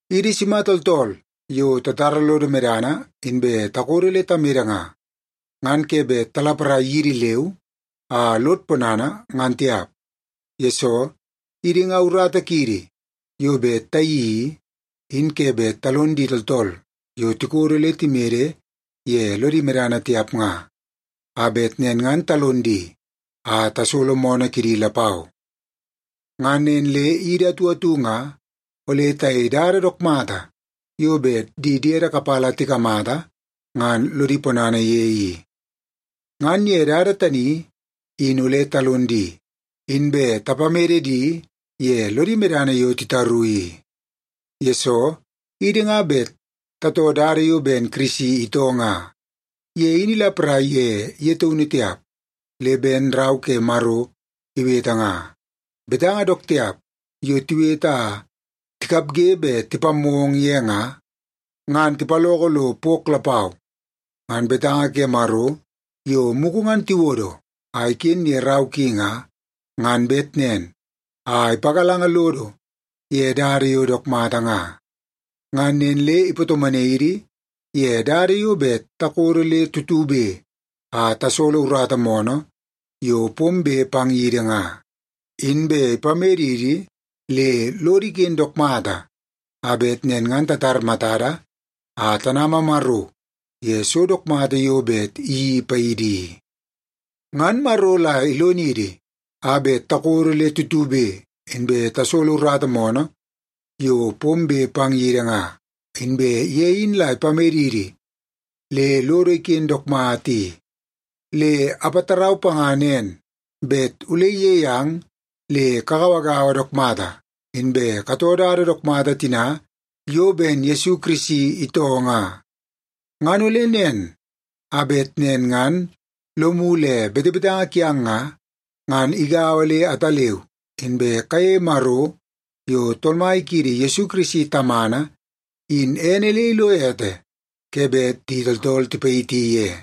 Idi sima tooltool yo tatara lodo medana inbe takodo le tamede nga, ngan ke bet talaparai yidi leu a lod ponana ngan tiap. Yesoo, idi nga urata kiidi yo bet tayeii i, in ke bet talon di tooltool yo tikodo le timede ye lodi medana tiap nga, a bet nen ngan talon di a tasolo moonoo kidi lapau. Ngan nen le idi atu atu nga ole tayei dada dook mata yo bet di diede kapala tikamata ngan lodi ponana ye i. Ngan ye dada tani, in ole talon di, inbe tapamede di ye lodi medana yo titaru i. Yesoo, idi nga bet tatoo dada yo ben Kirisi itoo nga, ye in ilaparai ye ye taunu tiap. Le ben Rau ke Maro iwete nga, “Betanga dook tiap yo tiwete a tikapge bet tipammoo ong ye nga, ngan tipaloko lo pok lapau.” Ngan betanga ke Maro yo mugu ngan tiwodo a iken ye rau ki nga, ngan bet nen a ipagalanga lodo ye dada yo dook mata nga. Ngan nen le ipatomonai idi ye dada yo bet takodo le tutube a tasolo urata moonoo yo pombe pang yidi nga, inbe ipamedidi le lodo iken dook mata, a bet nen ngan tatar matada a tanama Maro ye so dook mata yo bet iyeii paidi i. Ngan Maro la ilonidi a bet takodo le tutube inbe tasolo urata moonoo yo pombe pang yidi nga, inbe ye in la ipamedidi le lodo iken dook mata i, le apatarau panga nen bet ole iyei ang le kagauagaua dook mata, inbe katoo dada dook mata tina yo ben Yesu Kirisi itoo nga. Ngan ole nen, a bet nen ngan lomu le betebetanga kiang nga, ngan igaua le ataleu, inbe kayeie Maro yo Tool Mai kiidi Yesu Kirisi Tamana in ene le ilo ete ke bet di tooltool tipayiti ye.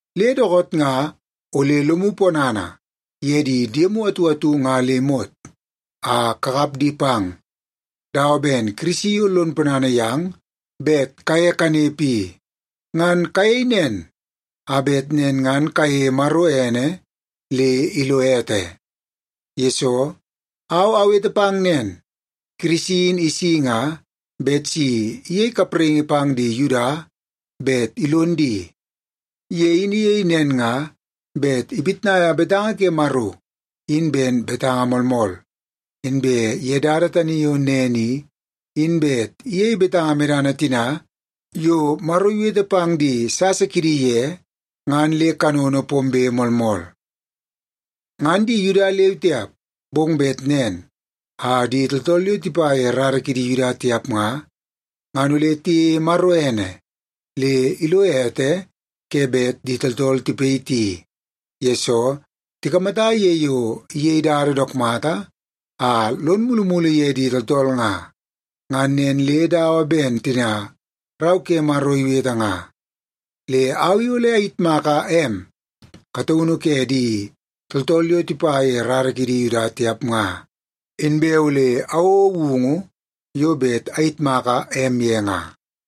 Le dookoot nga, ole lomu ponana ye di diemu atu atu nga le imot a kakap di pang, dawa ben Kirisi yo lon ponana yang bet kaye kanepe i. Ngan kayei nen, a bet nen ngan kayeie Maro ene le ilo ete. Yesoo, au awete pang nen, Kirisi in isi nga bet si iyei kapraingi pang di Yuda bet ilon di. Ye in iyei nen nga bet ipitnaia betanga ke Maro in ben betanga moolmool, inbe ye dada tani yo nen i, in bet iyei betanga medana tina yo Maro iwete pang di sasa kidi ye ngan le kanono pombe moolmool. Ngan di Yuda leu tiap, bong bet nen a di tooltool yo tipa ye rara kidi Yuda tiap nga, ngan ole tiyeie Maro ene le ilo ete ke bet di tooltool tipayiti, yesoo tikamata ye yo iyei dada dook mata a lon mulumulu ye di tooltool nga. Ngan nen le dawa ben tina Rau ke Maro iwete nga, “Le au i ole ayitmaka em kataunu ke di tooltool yo tipa ye rara kidi Yuda tiap nga. Inbe ole awouo woungu yo bet ayitmaka em ye nga.”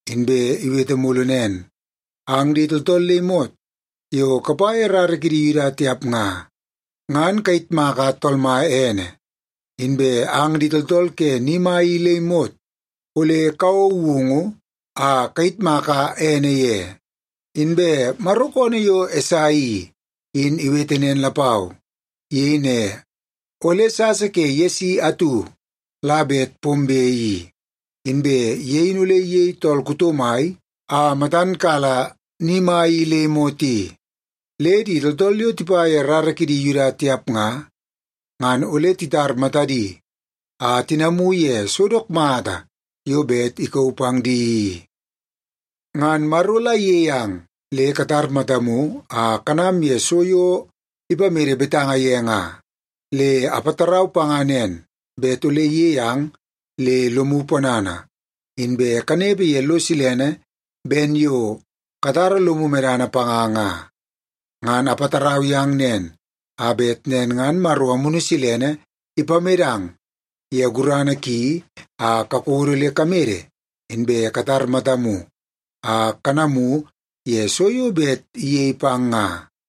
Inbe iwete mulu nen, “Ang di tooltool le imot yo kapa ye rara kidi Yuda tiap nga, ngan kayitmaka Tool Mai ene. Inbe ang di tooltool ke ni mai i le imot ole kawouo woungu a kayitmaka ene ye.” Inbe Maro koonoo yo Esai i, in iwete nen lapau. Iyei ne, “Ole sasa ke Yesi atu la bet pombe i, inbe ye in ole iyei tool kuto mai a matan kala ni mai i le imot i. Le di tooltool yo tipa ye rara kidi Yuda tiap nga, ngan ole titar matadi a tinamu ye so dook mata yo bet ikauu pang di i.” Ngan Maro la iyei ang le katar matamu a kanam ye so yo ipamede betanga ye nga. Le apatarau panga nen, bet ole iyei ang le lomu ponana, inbe kanepe ye lo silene ben yo katara lomu medana panga nga. Ngan apatarau yang nen, a bet nen ngan Maro Amunu Silene ipamedang ye gurana ki a kakodo le kamede, inbe katar matamu a kanamu ye so yo bet iyei pang nga.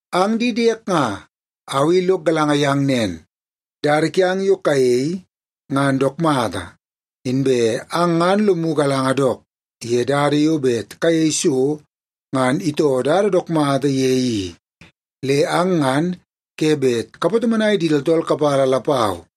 Ang di diek nga, au i lok galanga yang nen, dada kiang yo kayei ngan dook mata, inbe ang ngan lomu galanga dook ye dada yo bet kayei so ngan itoo dada dook mata ye i. Le ang ngan ke bet kapatomonai di tooltool kapala lapau.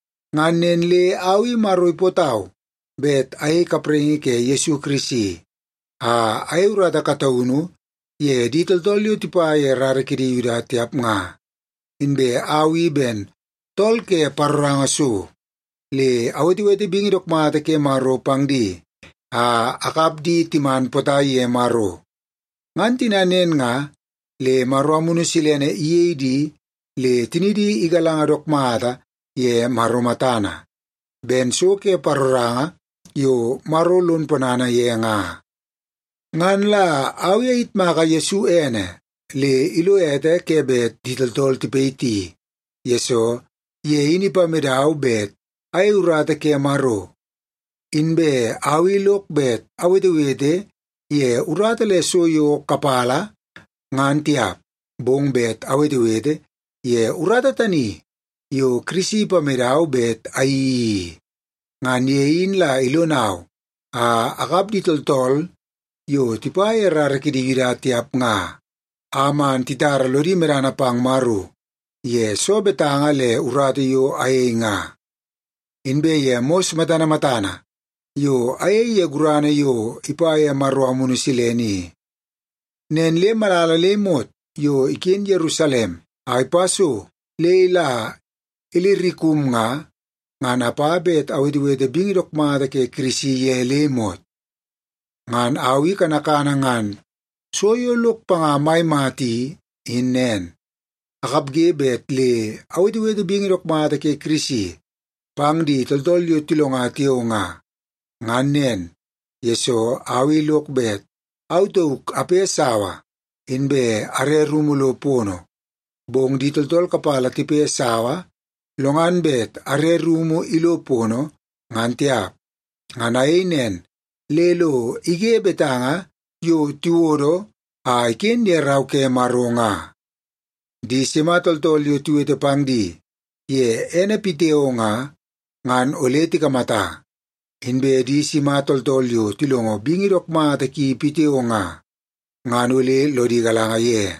Ngan nen le au i Maro ipootau bet ayei kapraingi ke Yesu Kirisi a ayei urata kataunu ye di tooltool yo tipa ye rara kidi Yuda tiap nga. Inbe au i ben tool ke paroranga so, le awetewete bingi dook mata ke Maro pang di a akap di timan potai ye Maro. Ngan tina nen nga, le Maro Amunu Silene iyei di le tinidi igalanga dook mata ye Maro matana, ben so ke paroranga yo Maro lon ponana ye nga. Ngan la au i ayitmaka Yesu Kirisi ene le ilo ete ke bet di tooltool tipayiti, yesoo ye in ipamedau bet ayei urata ke Maro. Inbe au i lok bet awetewete ye urata le so yo kapala, ngan tiap, bong bet awetewete ye urata tani yo Kirisi ipamedau bet ayeii i. Ngan ye in la ilonau a akap di tooltool yo tipa ye rara kidi Yuda tiap nga, a man titara lodi medana pang Maro ye soo betanga le urata yo ayei nga, inbe ye mos matana matana yo ayei ye gurana yo ipa ye Maro Amunu Silene i. Nen le malala le imot yo iken Yerusalem a ipa so le la Ilirikum nga, ngan apa bet awetewete bingi dook mata ke Kirisi ye le imot. Ngan au i kanakana ngan so yo lok panga mai mata i, in nen: Akapge bet le awetewete bingi dook mata ke Kirisi pang di tooltool yo tilonga tiao nga. Ngan nen, yesoo au i lok bet au tauk ape sawa inbe are rumu lo pono, bong di tooltool kapala tipe sawa, lo ngan bet are rumu ilo pono, ngan tiap. Ngan ayei nen le lo ige betanga yo tiwodo a iken ye Rau ke Maro nga, “Di sima tooltool yo tiwete pang di ye ene pitiao nga, ngan ole tikamata. Inbe di sima tooltool yo tilongo bingi dook mata ki pitiao nga, ngan ole lodi galanga ye.”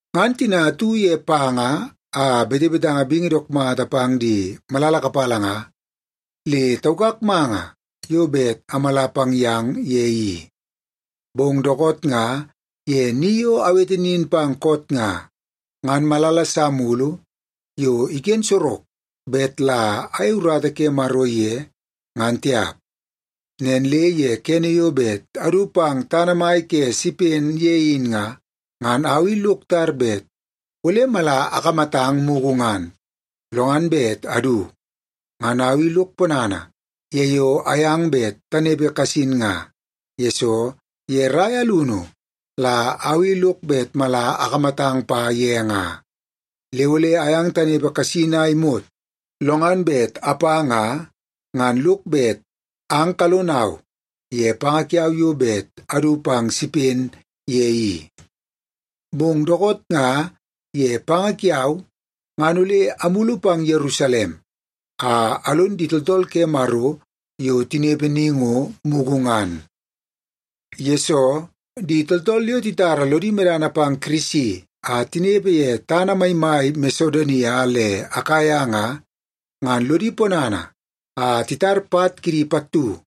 Ngan tina atu ye panga a betebetanga bingi dook mata pang di malala kapala nga, le taukak manga yo bet amala pang yang ye i. Bong dookoot nga ye ni yo awete nin pang koot nga, ngan malala sa mulu yo iken sorok bet la ayei urata ke Maro ye, ngan tiap. Nen le ye kene yo bet adu pang tana mai ke Sipen ye in nga, ngan au i lok tar bet ole mala akamatang mugu ngan, lo ngan bet adu. Ngan au i lok ponana ye yo ayang bet tanepe kasin nga, yesoo ye rai alunu la au i lok bet mala akamatang pa ye nga. Le ole ayang tanepe kasin a imot, lo ngan bet apa nga, ngan lok bet ang kalonau ye panga kiau yo bet adu pang Sipen ye i. Bong dookoot nga ye panga kiau, ngan ole amulu pang Yerusalem a alon di tooltool ke Maro yo tinepe ni ngo, mugu ngan. Yesoo, di tooltool yo titara lodi medana pang Kirisi a tinepe ye tana maimai Masedonia le Akaia nga, ngan lodi ponana a titar pat kidi pattu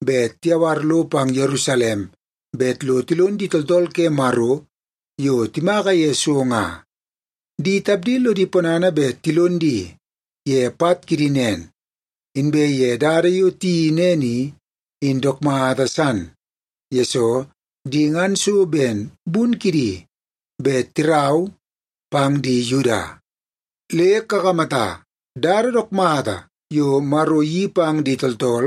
bet tiyawar lo pang Yerusalem bet lo tilon di tooltool ke Maro yo timaka ye so nga. Di tapdi lodi ponana bet tilon di ye pat kidi nen. Inbe ye dada yo tiyeii nen i, in dook mata san, yesoo di ngan so ben bun kidi bet tirau pang di Yuda. Le kakamata, dada dook mata yo Maro iyeii pang di tooltool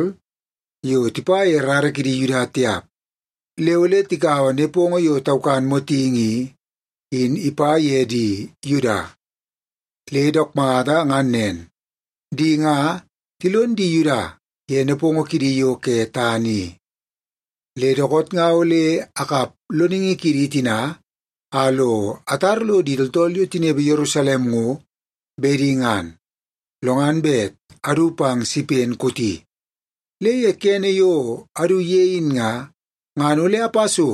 yo tipa ye rara kidi Yuda tiap le ole tikaua nepongo yo taukan motingi i, in ipa ye di Yuda. Le dook mata ngan nen, di nga tilon di Yuda ye nepongo kidi yo ke tana i. Le dookoot nga ole akap loningi kidi tina a lo atar lo di tooltool yo tinepe Yerusalem ngo, bedi ngan, lo ngan bet adu pang Sipen kooti. Le ye kene yo adu ye in nga, ngan ole apa so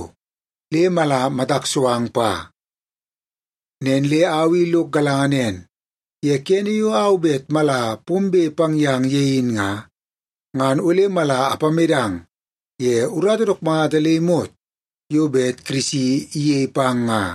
le mala matak so ang pa. Nen le au i lok galanga nen, ye kene yo au bet mala pombe pang yang ye in nga, ngan ole mala apamedang ye urata dook mata le imot yo bet Kirisi iyei pang nga.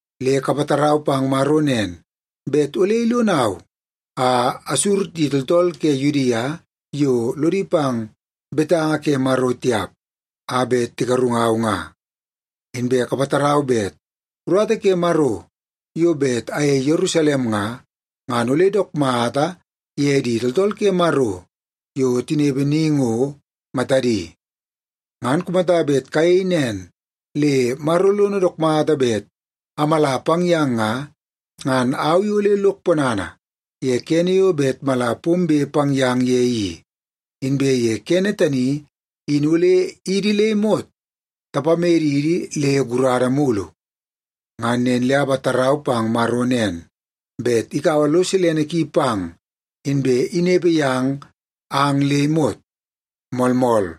Le kapatarau pang Maro nen, bet ole ilonau a asur di tooltool ke Yudia yo lodi pang betanga ke Maro tiap a bet tigarungau nga. Inbe kapatarau bet urata ke Maro yo bet ayei Yerusalem nga, ngan ole dook mata ye di tooltool ke Maro yo tinepe ni ngo, matadi. Ngan kumata bet kayei nen le Maro lono dook mata bet amala pang yang nga, ngan au i ole lok ponana ye kene yo bet mala pombe pang yang ye i. Inbe ye kene tani, in ole idi le imot tapamedidi le gurada mulu. Ngan nen le apatarau pang Maro nen, bet ikaua lo silene ki pang, inbe inepe yang ang le imot. Moolmool.